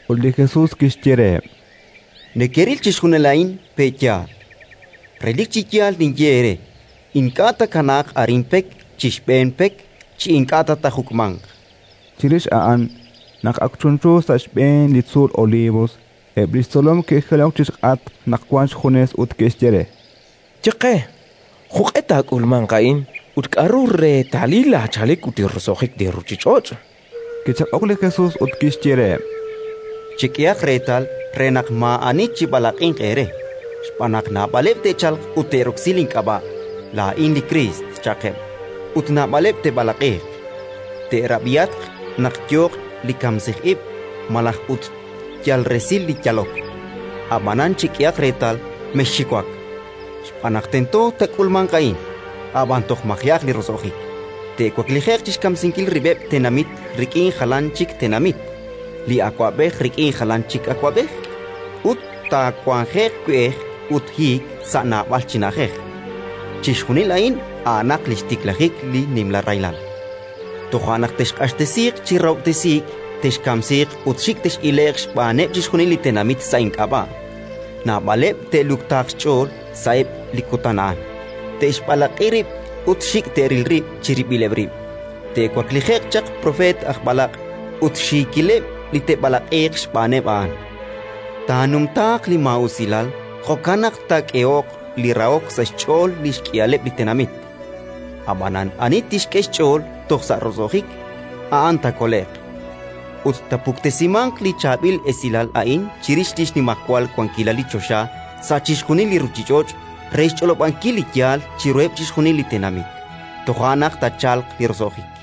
Ut li Jesus kixye reheb': —Nekeril chixjunil a'in, pe' yaal? Relik chi yaal ninye eere: ink'a' taakanaaq arin pek chi xb'een pek chi ink'a' ta taajuk'manq. Chirix a'an, naq ak chunchu sa' xb'een li tzuul Olivos, eb' li xtzolom ke'jilok chi xk'atq naq wank xjunes ut ke'xye re: —Ye qe jo'q'e taak'ulmanq a'in ut k'aru reetalil laachalik ut li roso'jik li ruuchich'och'. Kichaq'ok li Jesus ut kixye reheb': —Chek'ehaq reetal re naq maa'ani chib'alaq'inq eere. Xb'aan naq naab'aleb' te'chalq ut te'roksi link'ab'a': «Laa'in li Kriist», cha'qeb', ut naab'aleb' te'b'alaq'iiq. Teerab'ihatq naq yooq li kamsij ib' malaj ut yal resil li yalok, ab'anan chek'ehaq reetal, mexxiwak! Xb'aan naq tento taak'ulmanq a'in; ab'an toj maji'aq li roso'jik. Te'waklije'q chi xkamsinkil rib'eb' tenamit rik'in jalan chik tenamit, li awab'ej rik'in jalan chik awab'ej, ut taawanje'q we'ej ut hiik sa' naab'al chi na'ajej. Chixjunil a'in a'anaq li xtiklajik li nimla rahilal. “Toja' naq texq'axtesiiq chi rahob'tesiik, texkamsiiq ut xik' tex'ile'q xb'aaneb' chixjunil li tenamit sa' ink'ab'a'. Naab'aleb' te'luktaaq xch'ool sa'eb' li kutan a'an, te'xb'alaq'i rib' ut xik' te'ril rib' chirib'ileb' rib'. Te'waklije'q chaq propeet aj b'alaq' ut xiikileb' li te'b'alaq'iiq xb'aaneb' a'an. Taanumtaaq li maa'usilal, jo'kan naq taakeho'q li rahok sa' xch'ool li xk'ihaleb' li tenamit. Ab'anan ani tixk'e xch'ool toj sa' roso'jik, a'an taakole'q. Ut taapuktesimanq li chaab'il esilal a'in chirix li xnimajwal wankilal li choxa sa' chixjunil li ruuchich'och' re xch'olob'ankil li yaal chiruheb' chixjunil li tenamit: toja' naq taachalq li roso'jik.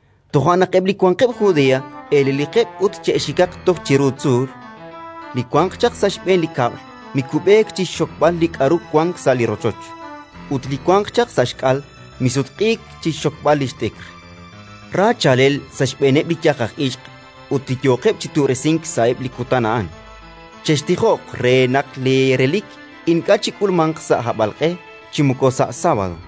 toja' naq eb' li wanqeb' Judea eleliqeb' ut che'xikaq toj chiru tzuul; li wanq chaq sa' xb'een li kab'l mikub'eek chi xxokb'al li k'aru wank sa' li rochoch, ut li wanq chaq sa' xk'al misutq'iik chi xxokb'al li xt'ikr. Ra chaalel sa' xb'eeneb' li yaj aj ixq ut li yooqeb' chi tu'resink sa'eb' li kutan a'an! Chextijoq re naq leerelik ink'a' chik'ulmanq sa' hab'alq'e chi moko sa' sábado.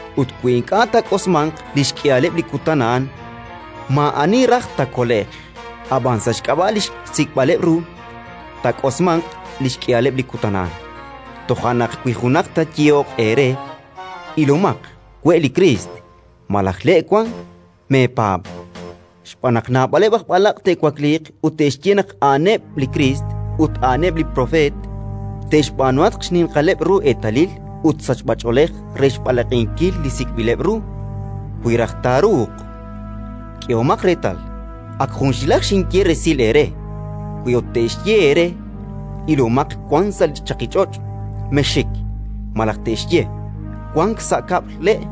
Ut wi ink'a' taak'osmanq li xk'ihaleb' li kutan a'an, maa'ani raj taakole'q; ab'an, sa' xk'ab'a' li sik'b'ileb' ru, taak'osmanq li xk'ihaleb' li kutan a'an. “Toja' naq wi junaq taayehoq eere: «Ilomaq, we' li Kriist», malaj: «Le' wank», meepaab'. Xb'aan naq naab'aleb' aj b'alaq' te'wakliiq ut te'xye naq a'aneb' li Kriist ut a'aneb' propeet; te'xb'aanuhatq xninqaleb' ru eetalil ut sachb'ach'oolej re xb'alaq'inkil li sik'b'ileb' ru, wi raj taaruuq. K'ehomaq reetal, ak junxilaj xinye resil eere. Wi ut te'xye eere: «Ilomaq, wank sa' chaqich'och'», mexxik; malaj te'xye: «Wank sa' kab'l le'»,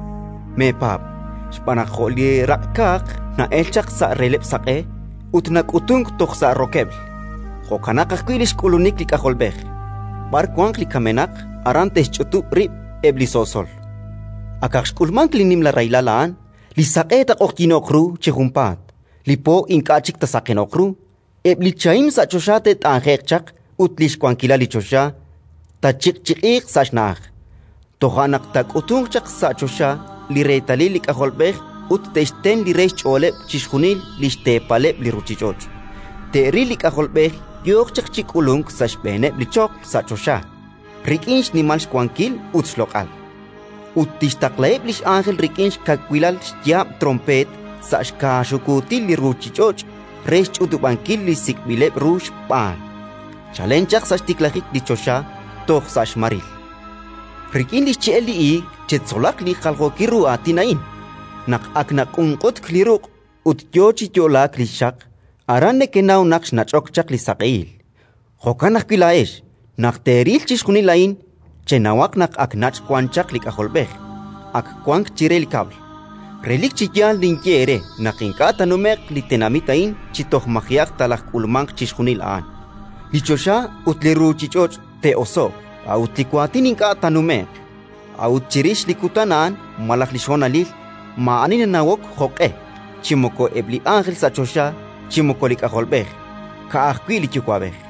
meepaab'. Xb'aan naq jo' li raq'kaaq na'elk chaq sa' releb'l saq'e ut nak'utunk toj sa' rokeb'l, jo'kanaq ajwi' li xk'ulunik li K'ajolb'ej. B'ar wanq li kamenaq, aran te'xch'utub' rib' eb' li so'sol. “Akaq xk'ulmank li nimla rahilal a'an, li saq'e taaq'oqyino'q ru chi junpaat, li po ink'a' chik taasaqeno'q ru, eb' li chahim sa' choxa te't'anje'q chaq ut li xwankilal li choxa taachiq'chiq'iiq sa' xna'aj. Toja' naq taak'utunq chaq sa' choxa li reetalil li K'ajolb'ej ut te'xten li re xch'ooleb' chixjunil li xteepaleb' li ruuchich'och': te'ril li K'ajolb'ej yooq chaq chi k'ulunk sa' xb'eeneb' li choql sa' choxa, rik'in xnimal xwankil ut xloq'al. Ut tixtaqlaheb' li x'ánjel rik'in xkawil yaab' tronpeet sa' xkaaxukuutil li ruuchich'och' re xch'utub'ankil li sik'b'ileb' ru xb'aan, chalen chaq sa' xtiklajik li choxa toj sa' xmaril. “Rik'in li xche'el li iig chetzolaq li jaljookil ru aatin a'in. Naq ak naq'unq'utk li ruq' ut yo chi yo'laak li xxaq, aran nekenaw naq xnach'ok chaq li saq'ehil. Jo'kan ajwi' laa'ex, naq teeril chixjunil a'in, chenawaq naq ak nach' wan chaq li K'ajolb'ej; ak wank chire li kab'l. Relik chi yaal ninye eere naq ink'a' taanume'q li tenamit a'in chi toj maji'aq talajk'ulmanq chixjunil a'an. Li choxa ut li ruuchich'och' te'oso'q, a'ut li waatin ink'a' taanume'q. Yo'lenqex! “A'ut chirix li kutan a'an malaj li xhonalil, maa'ani nanawok jo'q'e, chi moko eb' li ánjel sa' choxa chi moko li K'ajolb'ej, ka'ajwi' li Yuwa'b'ej.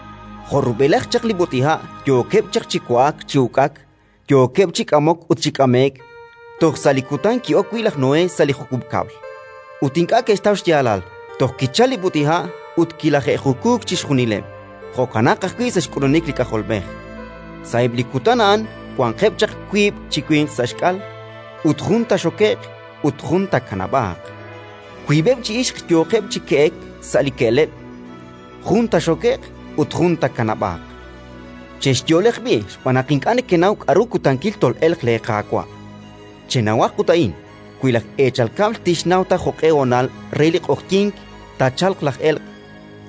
Jo' rub'elaj chaq li b'ut'iha' yookeb' chaq chi wa'ak chi uk'ak, yookeb' chi k'amok ut chi k'ame'k toj sa' li kutan ki'ok wi' laj Noé sa' li jukub' kab'l, ut ink'a' ke'xtaw xyaalal toj kichalk li b'ut'iha' ut kilaje'jukuuk chixjunileb', jo'kanaq ajwi' sa' xk'ulunik li K'ajolb'ej. Sa'eb' li kutan a'an wanqeb' chaq wiib' chi winq sa' xk'al: jun taaxoke'q ut jun taakanab'aaq; wiib'eb' chi ixq yooqeb' chi ke'ek sa' li ke'leb': jun taaxoke'q ut jun taakanab'aaq. “Chexyo'leq b'i', xb'aan naq ink'a' nekenaw k'aru kutankil tol'elq leeQaawa'. Chenawaq ut a'in: wi laj eechal kab'l tixnaw ta jo'q'e honal re li q'oqyink taachalq laj elq',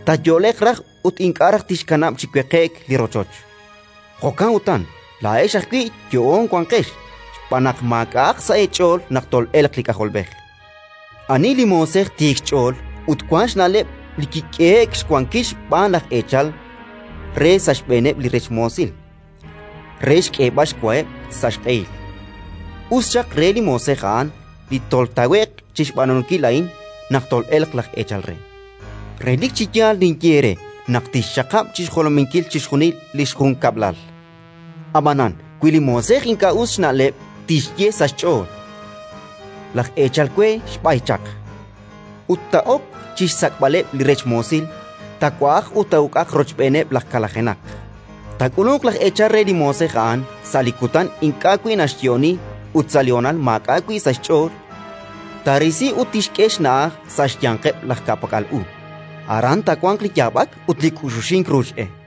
taayo'leq raj ut ink'a' raj tixkanab' chi weqe'k li rochoch. Jo'kan utan, laa'ex ajwi' yo'oon wanqex, xb'aan naq maak'a'aq sa' eech'ool naq tol'elq li K'ajolb'ej. “Ani li moosej tiik xch'ool ut wank xna'leb' li kik'ehe'k xwankil xb'aan laj eechal re sa' xb'eeneb' li rech moosil re xk'eeb'al xwaheb' sa' xq'ehil? Us xaq re li moosej a'an li toltawe'q chi xb'aanunkil a'in naq tol'elq laj eechal re. Relik chi yaal ninye eere naq tixxaqab' chi xjolominkil chixjunil li xjunkab'lal. Ab'anan, wi li moosej ink'a' us xna'leb' tixye sa' xch'ool: «Laj eechal we xb'ay chaq», ut taa'ok chi xsak'b'aleb' li rech moosil, taawa'aq ut taa'uk'aq rochb'eenaqeb' laj kalajenaq, taak'ulunq laj eechal re li moosej a'an sa' li kutan ink'a' wi' naxyo'oni ut sa' li honal maak'a' wi' sa' xch'ool, taarisi ut tixk'e xna'aj sa' xyanqeb' laj ka'pak'al u: aran taawanq li yaab'ak ut li k'uxuxink ruuch e.